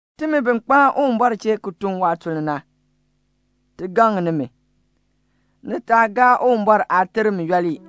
Timi bi kpaan Uwumbɔr chee ki tun waatuln na, ti gaŋ nimi, ni taa gaa Uwumbɔr aaterm yooli.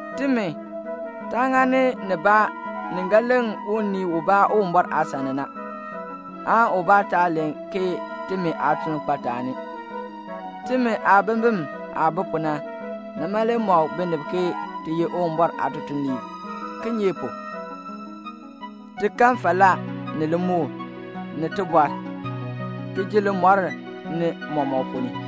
Timi, taa ŋani nibaa ni ga leŋ unii ubaa Uwumbɔr aasan ni na, aan ubaa taa len ke timi aatuln kpa taani. Timi aabimbin aah bi pu na, nima le mɔk binib ke ti ye Uwumbɔr aatutuliib. Kinye pu? ti kan falaa, ni limukl, ni tibɔr, ki ji limɔr ni mɔmɔk ponn ni.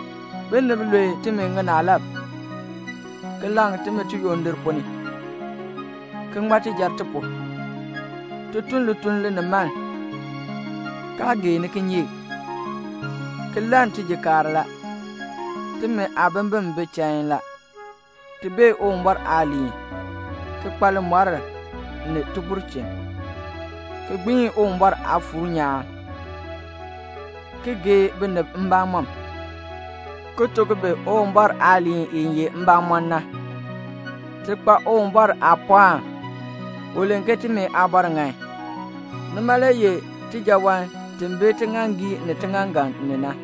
Binib lue timi ŋinaalab, ki laŋ timi tiyondir ponn ni, ki ŋma tijar ti pu. Ti tun lituln linimaln, kaa geeni kinyeek, ki lann tijikaar la. Timi aabimbin bi chain la. Ti bee Uwumbɔr aaliin, ki kpa limɔr ni tibulchin, ki gbiin Uwumbɔr Aafuur nyaan, ki gee binib mbamɔm, ki tuk bi Uwumbɔr aaliin i ye mbamɔn na. Ti kpa Uwumbɔr aapɔɔn. U len ke timi aabɔr ŋan. Nima le ye tijaawan ti bi tiŋaaŋgii ni tiŋaaŋgan ni na.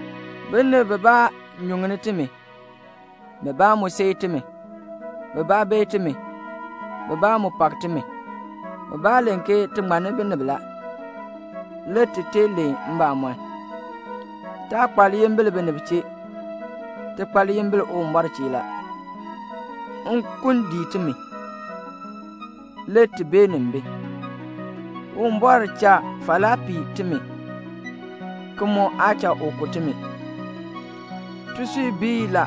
Binib bibaa nyuŋni timi, bibaa mu seei timi. Bibaa beei timi, bibaa mu pak timi. Bibaa len ke ti ŋmanni binib la. Le ti tee len mbamɔn. Taa kpa liyimbil binib chee. Ti kpa liyimbil Uwumbɔr chee la. Nkun dii timi, le ti beenin bi. Uwumbɔr cha falaa pii timi, ki mu aa cha u ku timi. Tisui bii la;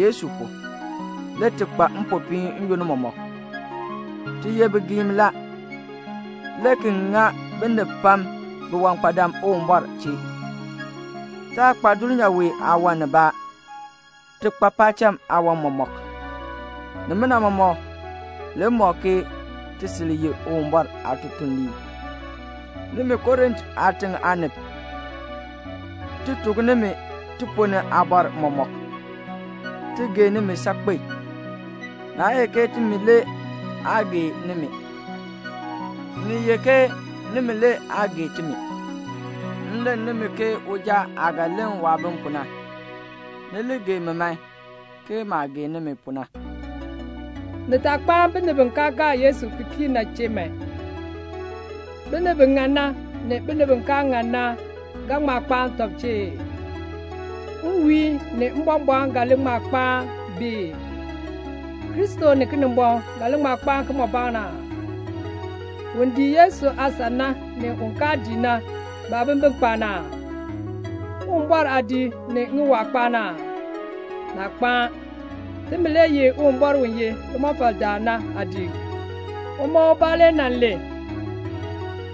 Yesu pu, le ti kpa mpopiin n-yoonn mɔmɔk. Ti ye bigiim la, le ki ŋa binib pam biwankpadam Uwumbɔr chee. Taa kpa dulnyaa wee aawan nibaa. Ti kpa paacham aawan mɔmɔk. Nimina mɔmɔk le mɔk ke ti sil ye Uwumbɔr aatutuliib. Nimi Korint aatiŋ aanib, ti tuk nimi tiponn ni aabɔr mɔmɔk. Ti gee nimi saakpen. Naa ye ke timi le aa gee nimi. Ni ye ke nimi le aa gee timi. M len nimi ke uja aah ga len waabim pu na. Ni li gee mi man, ke maah gee nimi pu na. Ni taa kpaan binib bi kaa gaa Yesu ki kii na chee man. Binib bi ŋan na, ni binib bi kaa ŋan na ga ŋma kpaan tɔb chee ee? Nwiihn ni mbɔmbɔɔn ga li ŋma kpaan bi ii? Kristo ni Kinimbɔŋ ga li ŋma kpaan kimɔbaan aa? Un dii Yesu aasan na, ni un kaa dii na, baabimbin kpaan aa? Uwumbɔr aadiik ni ŋiwaa kpaan aa? Naa kpaan. Timi le ye Uwumbɔr u ye limɔfaldaan na aadiik. Uma ubaa le nan len,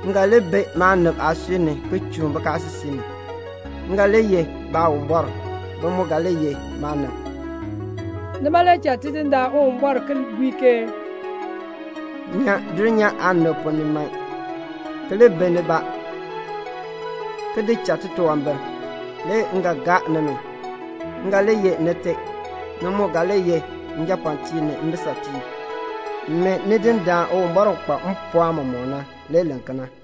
"M ga li bi maanib aasui ni ki chuun bikaasisik ni. M ga li ye Baawumbɔr, bi mu ga li ye maanib." Nima le cha Tidindaan Uwumbɔr ki bui ke "Nyan dulnyaa aanib ponn ni man, ki li bi nibaa, ki di cha titunwambir, le m ga gaa nimi. M ga li ye Nite; ni mu ga li ye njapɔɔtiib ni mbisatiib." Tidindaan Uwumbɔr u kpa mpɔɔn mɔmɔk na, le len kena.